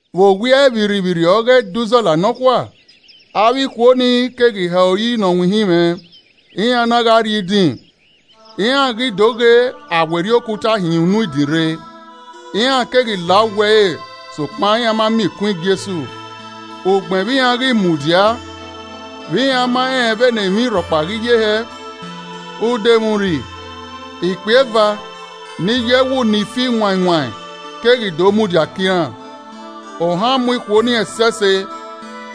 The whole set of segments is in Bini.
Vbe owiẹ vbirrivbirri ọghe Ẹdẹ uzọla nọkhua, avbe ikhuo ni keghi hẹ ori ne ọ winhin mwẹ, iran na gha rrrie idin. Iran ghi do ghe, a werriẹ okuta hin unu idin rre. Iran keghi la uwu ẹre sokpan iran ma miẹn ikun Jesu. Ugbẹn vbe iran ghi mudia, vbe iran ma rẹn vbene emwi rhọkpa ghi ye hẹ, udomwurri, ikpia eva ni yọ ẹwu ni fi wain wain keghi do mudia ke iran. Ohan mu ikhuo ni ẹsẹse,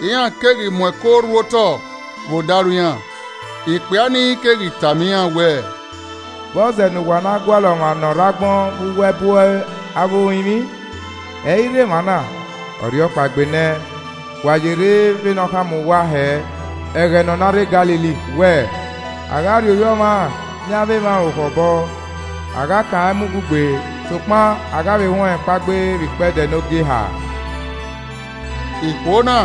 iran keghi mu ẹko rhu otọ vbe odaro iran, ikpia ni keghi tama iran wẹẹ, “Vbọzẹ ne uwa na gualọ ọmwa ne ọ rre agbọn vbe uwu ẹbu avbe orinmwi? Ẹ i rre emwa na, ọ rhiọkpaegbe nẹ, wa yerre vbe ne ọ khama uwa hẹ ẹghẹ ne ọ na rre Galili wẹẹ, ‘A gha rhie Ovbi Ọmwa yan avbe emwa orukhọ obọ, a gha kan rẹn mu ugbugbe, sokpan a gha vbe huẹn ọnrẹn kpaegbe vbe ikpẹdẹ ne ogieha.’” Ikhuo na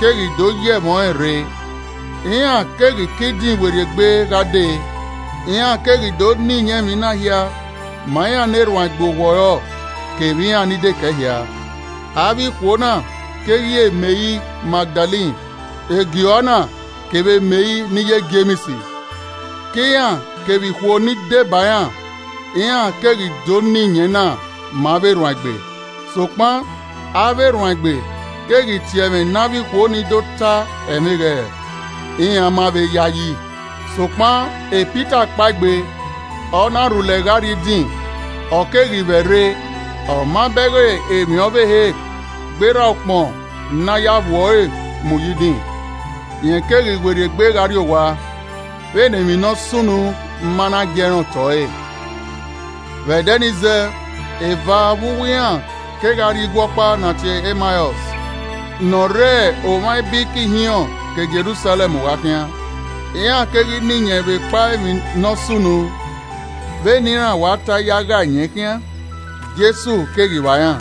keghi do ye ẹmwẹ ọnrẹn rre. Iran keghi ke idin werriegbe gha dee, iran keghi do na iyẹn emwi na hia ma iran ne erhuanegbe owọrọ kevbe iran ni dekẹe hia. Avbe ikhuo na keghi re Meri Magdalen, Joana, kevbe Meri ne iye Jems. Ke iran kevbe ikhuo ni deba iran, iran keghi do na iyẹn na ma avbe erhuanegbe. Sokpan avbe erhuanegbe keghi tie ẹmwẹ ne avbe ikhuo nii do ta ẹmwẹ eghẹrẹ, iran ma vbe yayi. Sokpan Pita kpaegbe, ọ na rhulẹ gha rrie idin, ọ keghi vbẹrre, ọ ma bẹghe emwi ọvbehe gberra ukpọn ne a ya vbuẹ ọre mu ye idin. Rẹn keghi werriegbe gha rrie owa vbene emwi ne ọ sunu ma na giee rẹn otọ ẹre. Vbe ẹdẹ nii zẹẹ, eva vbe uwu iran kegha rrie igue ọkpa ne a tie ẹre Emaọs ne ọ re omwa ibiriki ihinrọn ke Jerusalẹm gha khian. Iran keghi na iyẹn vbe ekpa emwi ne ọ sunu. Vbene iran wa tae ya gha iyẹn khian, Jesu keghi vba iran,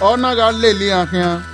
ọ na gha lele iran khian.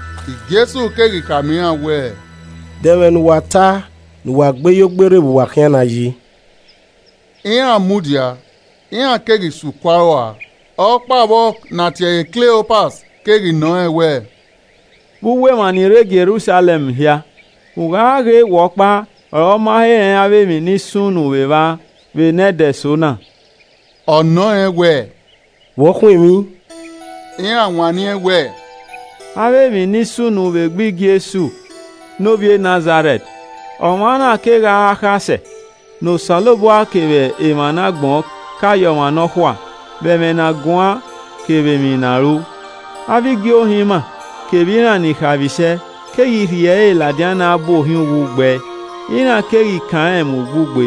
Jesu keghi khama iran wẹẹ, “De ẹmwẹ ne uwa ta ne uwa gbe yo gbe rre vbe uwa khian na yi?” Iran mudia, iran keghi suku aro ua. Ọkpa vbe uwe iran ne a tie ẹre Kleopas keghi nọ rẹn wẹẹ, “Vbe uwu emwa ni rre Jerusalẹm hia, ugha ghe wẹ ọkpa ọre ọ ma he rẹn avbe emwi ni sunu vbe evba vbe ne ẹdẹ eso na.” Ọ nọ rẹn wẹẹ, “Vbọ khun emwi?” Iran wanniẹn wẹẹ, “Avbe emwi ni sunu vbe egbe Jesu ne ovbi e Nazarẹt nọ vbe gha re akhasẹ, ne Osanobua kevbe emwa ne agbọn ka ye ọmwa nọkhua vbe ẹmwẹ ne a guan kevbe emwi ne a ru. Avbe igie ohẹn ima kevbe iran ni khaemwisẹ keghi rhie ẹre ladian ne a bu ohiẹn uwu gbe ẹe, iran keghi kan rẹn mu ugbugbe.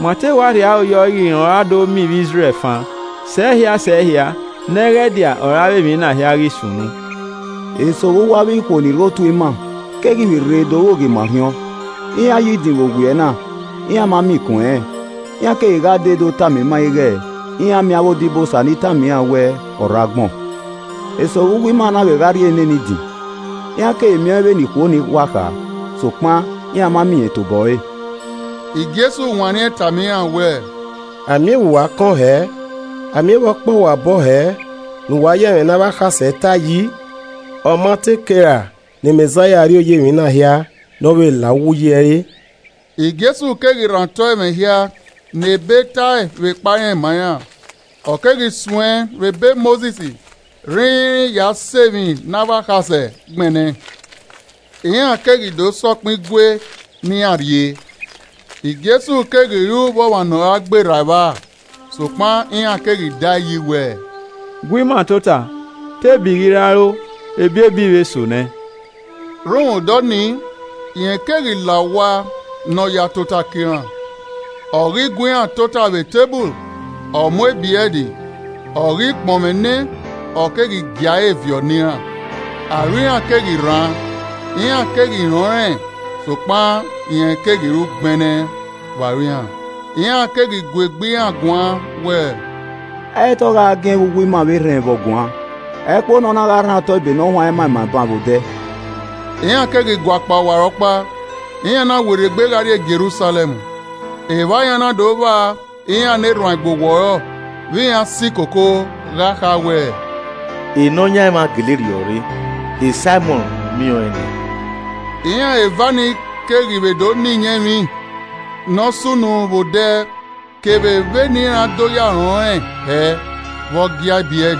Ma te wa rhie aro yọ ighẹ rẹn ọre ọ ra do miẹn ivbi Izrẹl fan, sẹhia sẹhia, nẹghẹdia ọre avbe emwi na hia ghi sunu. Eso vbe uwu avbe ikhuo ni rre otu ima keghi vbe rre do rueghe ima orhiọn. Iran yo idin vbe owiẹ na. Iran ma miẹn ikun ẹnrẹn. Iran keghi gha dee do tama ima ighẹ iran miẹn avbe odibosa ni tama iran wẹ ọ rre agbọn. Eso vbe uwu ima na vbe gha rrie nene idin, iran keghi miẹn ọẹn vbene ikhuo ni wa kha, sokpan iran ma miẹn irẹn tobọ ẹre.” Jesu wanniẹn tama iran wẹẹ, “A miẹn vbe uwa kọn hẹẹ! A miẹn vbe ọ kpẹ uwa obọ hẹẹ ne uwa ya ẹmwẹ ne avbe akhasẹ tae yi! Ọ ma te kei ra ne Mẹzaia rrioya emwi na hia ne ọ vbe la uwu uyi ẹre?” Jesu keghi rhan otọ ẹmwẹ hia ne Ebe tae vbekpa irẹn ma iran. Ọ keghi suẹn vbe ebe Mosis rhinrin ya sẹ emwi ne avbe akhasẹ gbẹnnẹ. Iran keghi do sẹ ọkpẹn igue ne iran rrie. Jesu keghi ru vbe ọmwa ne ọ ra gberra evba. Sokpan iran keghi daeyi wẹẹ, “Gu ima tota, te ebi ghi ra ro, ebiebi vbe so nẹ.” Rhunmwuda ọnii rẹn keghi la owa ne ọ ya tota ke iran. Ọ ghi gu iran tota vbe eteburu, ọ mu ebrẹd, ọ ghi kpọnmwẹ nẹ, ọ keghi gia ẹre viọ ne iran. Aro iran keghi rhan, iran keghi rẹn ọnrẹn sokpan rẹn keghi ru gbẹnnẹ vbe aro iran. Iran keghi gu egbe iran guan wẹẹ, “Ẹ i re te ọ gha giẹn vbe uwu ima vbe erhẹn vbe ọ guan, ẹkpo ne ọ na gha rhan otọ ebe ne ọ huanrẹn ma ima ban vbe odẹ!” Iran keghi guakpao ọwarọkpa, iran na werriegbe gha rrie Jerusalẹm, evba iran na do vba iran ne erhuanegbe owọrọ vbe iran si koko gha kha wẹẹ, “Nọyaẹnmwa gele rhiọrre, Saimọn miẹn ọẹn nẹ.” Iran eva nii keghi vbe do na iyẹn emwi ne ọ sunu vbe odẹ kevbe vbene iran do rẹn ọnrẹn hẹ vbe ọ gia ebrẹd.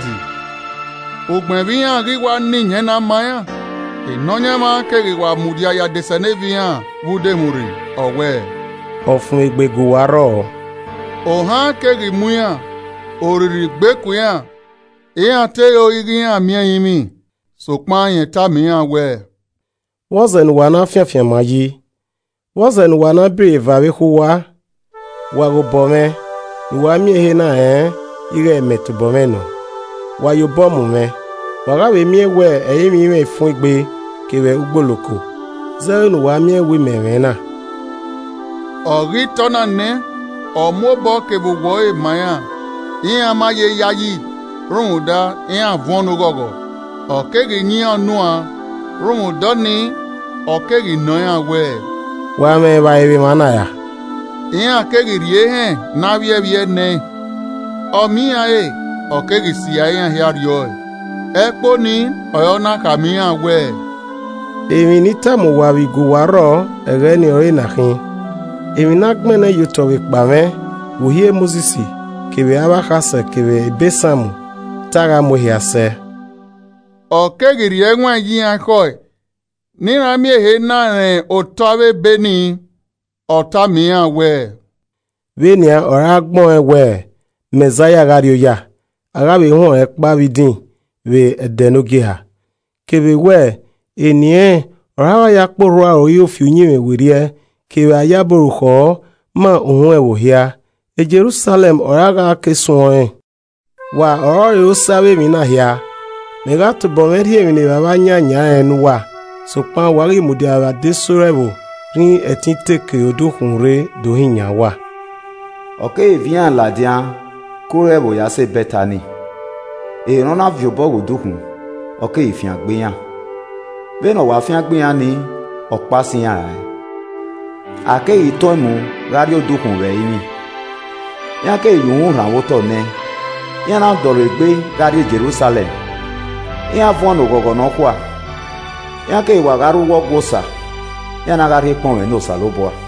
Ugbẹn vbe iran ghi wa na iyẹn na ma iran, Nọyaẹnmwa keghi wa mudia ye adesẹneva iran vbe udomwurri, ọ wẹẹ, “Ọfumwegbe gu uwa rrọọ.” Ohan keghi mu iran, orrirri gbe ku iran, iran te ro ighẹ iran miẹn ẹrinmwi. Sokpan rẹn tama iran wẹẹ, “Vbọzẹ ne uwa na fian afianma yi. Vbọzẹ ne uwa na bọ iro eva vbe ekhọe uwa? Wa ghe obọ mwẹ ne uwa miẹn ehe na rẹn ighẹ mẹ tobọ mwẹ nọ. Wa ya obọ mu mwẹ, wa gha vbe miẹn wẹ ẹrinmwi i mwẹ ifun egbe kevbe ugboloko zẹ vbene uwa miẹn wẹ mẹ mwẹ na.” Ọ ghi ta ọna nẹ, ọ mu obọ kevbe owẹ ọre ma iran. Iran ma ye yayi rhunmwuda iran vuọn ne oghọghọ, Ọ keghi yan iran unuan, rhunmwuda ọnii, ọ keghi nọ iran wẹẹ, “Wa mwẹ evbare vbe emwana ra?” Iran keghi rhie ehẹn ne avbiẹvbiẹe nẹẹn. Ọ miẹn iran re, ọ keghi sirra iran hia rriọe. Ẹkpo nii ọre ọ na khama iran wẹẹ, “Emwi ne I tama uwa vbe I gu uwa rrọọ ẹghẹ nii ọre ena khin: emwi ne a gbẹnnẹ ye otọ vbekpa mwẹ vbe Uhi e Mosis, kevbe avbe akhasẹ kevbe ebe Psalm, te a gha mu ẹn sẹ.” Ọ keghi rhie ẹwaẹn ye iran ekhọe ne iran miẹn ehe na rẹn otọ avbe Ebe ni. Ọ tama iran wẹẹ, “Vbe nian ọre a gbẹn ọẹn wẹẹ Mẹzaia gha rri oya, a gha vbe huẹn ọnrẹn kpao vbe idin vbe ẹdẹ ne ogieha. Kevbe wẹẹ, eni ẹnrẹn ọre a gha ya kpe orhu a roiro fi uyinmwẹ werriẹ kevbe a yabọ orukhọ ma uhunmwu ẹvbo hia, Jerusalẹm ọre a gha ke suẹ ọnrẹn. Wa ọrọre osẹe avbe emwi na hia. Mẹ gha tobọ mwẹ rhie emwi ne Evbavba yan eyan rẹn ne uwa. Sokpan wa ghi mudia vbe adesẹ ore ẹvbo rhinrin ẹtin te ke odukhunmwu rre do hin yan uwa.” Ọ keghi viọ iran ladian ke ore ẹvbo ya sẹ Bẹtani, ehe ne ọ na viọ obọ ghe odukhunmwu, ọ keghi fiangbe iran. Vbene ọ wa fiangbe iran ni, ọ kpao sẹ iran rae, a keghi tọn ẹn mu gha rrie odukhunmwu vbe ẹrinmwi. Iran keghi ya uhunmwu rhanmwẹ otọ nẹẹn, iran na dọlegbe gha rrie Jerusalẹm. Iran vuọn ne oghọghọ nọkhua. Iran keghi wa gha rre uwu Ọgua Osa, iran na gha rhie ekpọnmwẹ ne Osanobua.